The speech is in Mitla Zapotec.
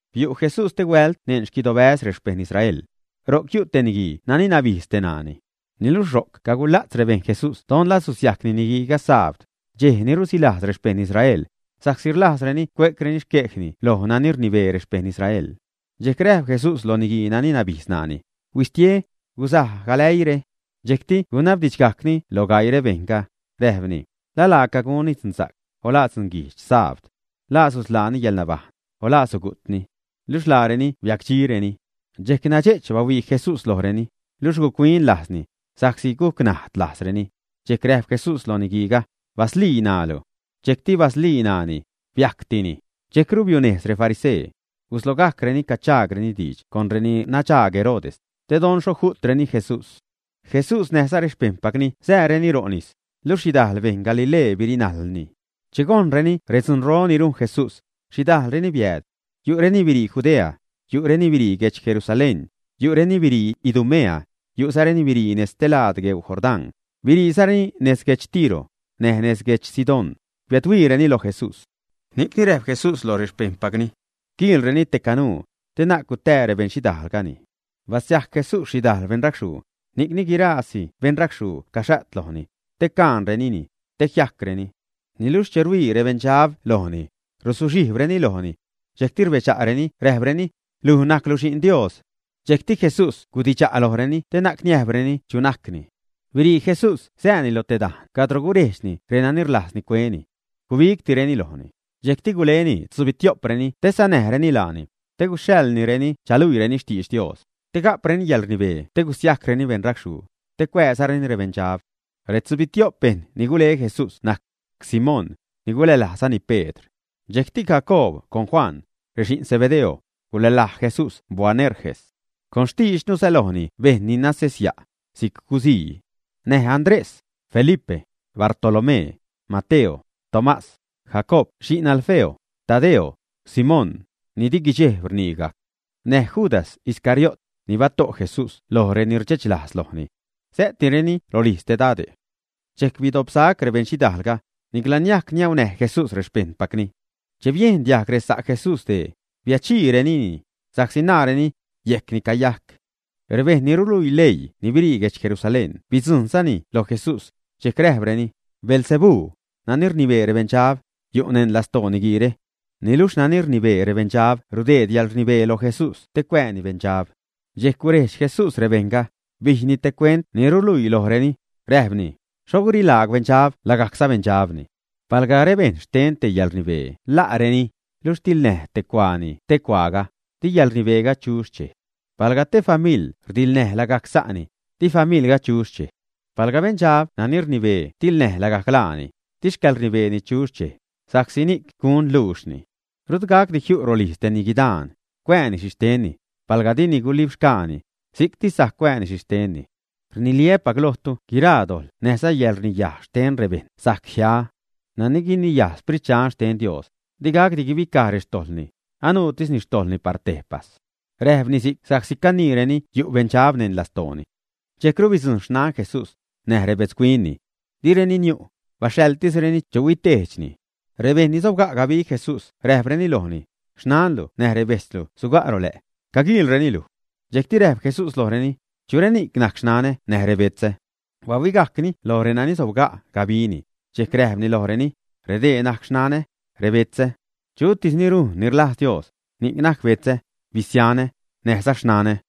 Biu' Jesús stehuält neṉ xquidobäz rexpejṉ Israel. Ro'c yu' te niguii nani nabijdz te ṉaani. Niluxh ro'c cagula'tz rebejṉ Jesús don la susiajcni niguiiga sabd, dxej ni rusilajz rexpejṉ Israel, sa'csi rlajzreni cue'creni xquejni loj nani rnibee rexpeṉ Israel. Dxejc räjp Jesús lo niguii nani nabijdz ṉaani: ―Huistie, guzuj galäiire. Dxejcti gunabdidxgajcni loj gaii rebejṉga, räjpni: ―¿La laaca gunni dzunza'c, o la dzunguijdx, sabd, ä? ¿La susḻaani yäḻnabajṉ, o la sugu'tni? Luxh laareni biacdxireni. Dxejc nadxe'ch bahuii Jesús lojreni, luxh guc-huin lajzni, sa'csi guc najd lajzreni. Dxejc räjp Jesús loj niguiiga: ―Baslii ṉaalu. Dxejcti basliini ṉaani. Biajctini. Dxejcru biunejz refarisee. Guslogajcreni caguchaagreni diidx con reni nadxaag Herodes, te don xho ju'treni Jesús. Jesús näjza rexpejṉpacni sääreni ro' nis, luxh xhidajl beṉ Galilee birinajlni. Che gojnreni redzunro ni rujn Jesús, xhidajlreni biääd. Yu'reni birii Judea, yu'reni birii guedx Jerusalén, yu'reni birii Idumea, yu'zareni birii nejz stelaad gueu Jordán, biriizareni nez guedx Tiro, näj nez guedx Sidón, biädhuiireni loj Jesús. Ni'cni räjp Jesús loj rexpejṉpacni quiilreni te canuu, te na'c gutää rebeṉxhidaalgani. Abasiajc Jesús xhidajl beṉracxhuu, ni'cni guiraasi beṉracxhuu caxa't lojni, te caṉrenini te jiajcreni. Niluxh che rhuii rebeṉdxab lojni, ruzuxhijbreni lojni. Dxejcti rbedxa'reni räjpreni: ―Luj najclu Xi'n Dios. Dxejcti Jesús gudidxa' lojreni te na'c niäjbreni chu najcni. Birii Jesús sääni lo te dajne' cadro gurejdxni renani rlajzni cueni. Gubigtireni lojni. Dxejcti guleni tzubitio'preni te sanäjreni laani, te guxhaḻnireni chaluiireni xtidx Dios; te ga'preni yäḻrnibee te gusiajcreni beṉracxhuu, te cuääzareni rebeṉdxab. Retzubitio'p bejṉ ni gule Jesús najc: Simón, ni gulälajzani Pedr. Dxejcti Jacoob con Juan, rexi'n Zebedeo, gulälaj Jesús Boanerges. Con xtiidxnu sälojni bejṉ ni nasesya', si'c guzii. Näj Andrés, Felipe, Bartolomé, Mateo, Tomás, Jacoob xi'n Alfeo, Tadeo, Simón, ni di guidxejb rnigajc, näj Judas Iscariot, ni bato' Jesús loj reni rdxechlajz lojni. Sä'tireni rolijz te dade'. Dxejc bidopsac rebeṉxhidaalga; nicla niajc niaunäj Jesús rexpejṉpacni. Che biejn diajg resa' Jesús dee, biädxhiirenini, sa'csi naareni, yejcni cayajc. Rebejṉ ni ruluii leii ni birii guedx Jerusalén bidzujṉza lo Jesús, dxejc räjpreni: ―Beelzebú, nani rnibee rebeṉdxab, yu' neṉ lastoo niguiire. Niluxh nani rnibee rebeṉdxab rudeed yäḻrnibee lo Jesús te cuääni beṉdxab. Dxejc gurejdx Jesús rebejṉga, bijyni te cuent ni ruluii lojreni, räjpni: ―¿Xho gurilaagw beṉdxab lagajc sabeṉdxabni? Palga rebejṉ xten te yäḻrnibee la'reni, luxh tiḻnäj te cuaani ste cuaaga, di yäḻrnibeega chu xchej. Palga te famiḻ rdiḻnäj lagajc sa'ni, di familga chu xchej. Palga beṉdxab nani rnibee tiḻnäj lagajc laani, di xcäḻrnibeeni chu xchej, sa'csi ni'c gun luuxni. ’Rut gacdi jiu' rolijz te niguidaan, cuanni xhixhtenni, palga dini gulibxgaani, si'ctis sajc cuanni xhixhtenni. ’Rniliä́pac lojtu guiraa dojḻ näjza yäḻrniyaj xten rebejṉ sajc jia. Nani guiniyaj Sprit Dxan xten Dios, digacdi guibicaj rextojḻni, anuutisni xtojḻni par tejpas. Räjpni si'c sa'csi caniireni yu' beṉdxab neṉ lastooni. Dxejcru bidzujṉ xnan Jesús, näj rebetzhuinni. Direni niu', baxhaḻtisreni chu huitejdxni. Rebejṉ ni sobga' gabi Jesús räjpreni lojni: ―Xnanlu näj rebejtzlu suga' ro lä', caguiilreni luj. Dxejcti räjp Jesús lojreni: ―¿Chu reni'c najc xnanä näj rebetzä? Bahuigajcni loj renani sobga' gabini, dxejc räjpni lojreni: ―Redee najc xnanä, rebetzä. Chutis ni rujn ni rlajz Dios, ni'c najc betzä, bisianä, näjza xnanä.